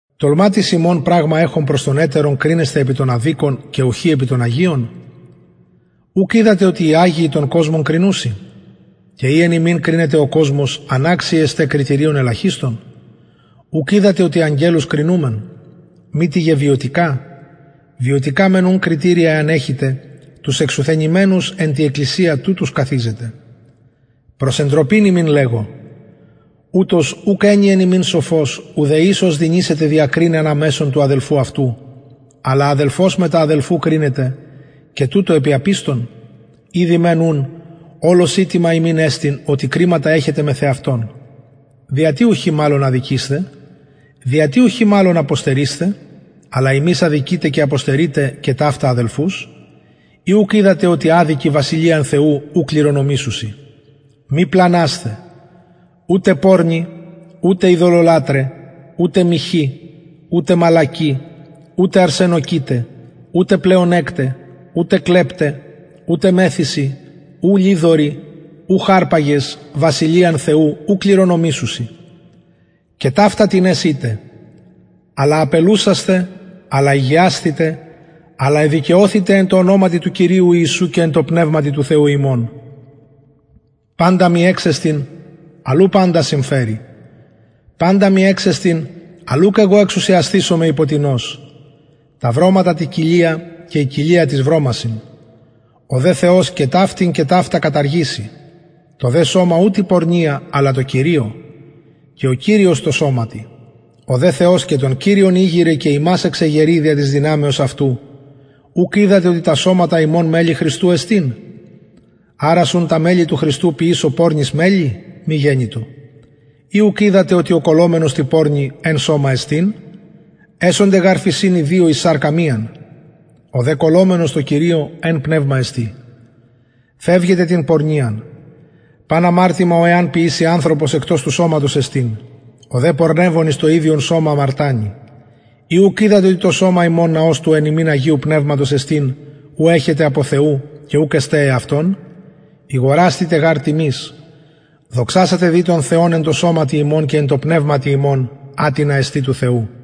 τολμα τις υμων πραγμα εχων προς τον ετερον κρινεσθαι επι των αδικων και ουχι επι των αγιων ουκ οιδατε οτι οι αγιοι τον κοσμον κρινουσιν και ει εν υμιν κρινεται ο κοσμος αναξιοι εστε κριτηριων ελαχιστων ουκ οιδατε οτι αγγελους κρινουμεν μητι γε βιωτικα βιωτικα μεν ουν κριτηρια εαν εχητε τους εξουθενημενους εν τη εκκλησια τουτους καθιζετε προς εντροπην υμιν λεγω ουτως ουκ ενι εν υμιν σοφος ουδε εις ος δυνησεται διακριναι ανα μεσον του αδελφου αυτου αλλα αδελφος μετα αδελφου κρινεται και τουτο επι απιστων ηδη μεν ουν ολως ηττημα υμιν εστιν οτι κριματα εχετε μεθ εαυτων δια τι ουχι μαλλον αδικεισθε δια τι ουχι μαλλον αποστερεισθε αλλα υμεις αδικειτε και αποστερειτε και ταυτα αδελφους η ουκ οιδατε οτι αδικοι βασιλειαν θεου ου κληρονομησουσιν μη πλανασθε ουτε πορνοι ουτε ειδωλολατραι ουτε μοιχοι ουτε μαλακοι ουτε αρσενοκοιται ουτε πλεονεκται ουτε κλεπται ουτε μεθυσοι ου λοιδοροι ουχ αρπαγες βασιλειαν θεου ου κληρονομησουσιν και ταυτα τινες ητε αλλα απελουσασθε αλλα ηγιασθητε αλλ εδικαιωθητε εν τω ονοματι του κυριου ιησου και εν τω πνευματι του θεου ημων παντα μοι εξεστιν αλλ ου παντα συμφερει παντα μοι εξεστιν αλλ ουκ εγω εξουσιασθησομαι υπο τινος τα βρωματα τη κοιλια και η κοιλια τοις βρωμασιν ο δε θεος και ταυτην και ταυτα καταργησει το δε σωμα ου τη πορνεια αλλα τω κυριω και ο κυριος τω σωματι ο δε θεος και τον κυριον ηγειρεν και ημας εξεγερει δια της δυναμεως αυτου ουκ οιδατε οτι τα σωματα υμων μελη χριστου εστιν αρας ουν τα μελη του χριστου ποιησω πορνης μελη μη γενοιτο ουκ οιδατε οτι ο κολλωμενος τη πορνη εν σωμα εστιν εσονται γαρ φησιν οι δυο εις σαρκα μιαν ο δε κολλωμενος τω κυριω εν πνευμα εστιν φευγετε την πορνειαν παν αμαρτημα ο εαν ποιηση ανθρωπος εκτος του σωματος εστιν ο δε πορνευων εις το ιδιον σωμα αμαρτανει η ουκ οιδατε οτι το σωμα υμων ναος του εν υμιν αγιου πνευματος εστιν ου εχετε απο θεου και ουκ εστε εαυτων ηγορασθητε γαρ τιμης δοξασατε δη τον θεον εν τω σωματι υμων και εν τω πνευματι υμων ατινα εστιν του θεου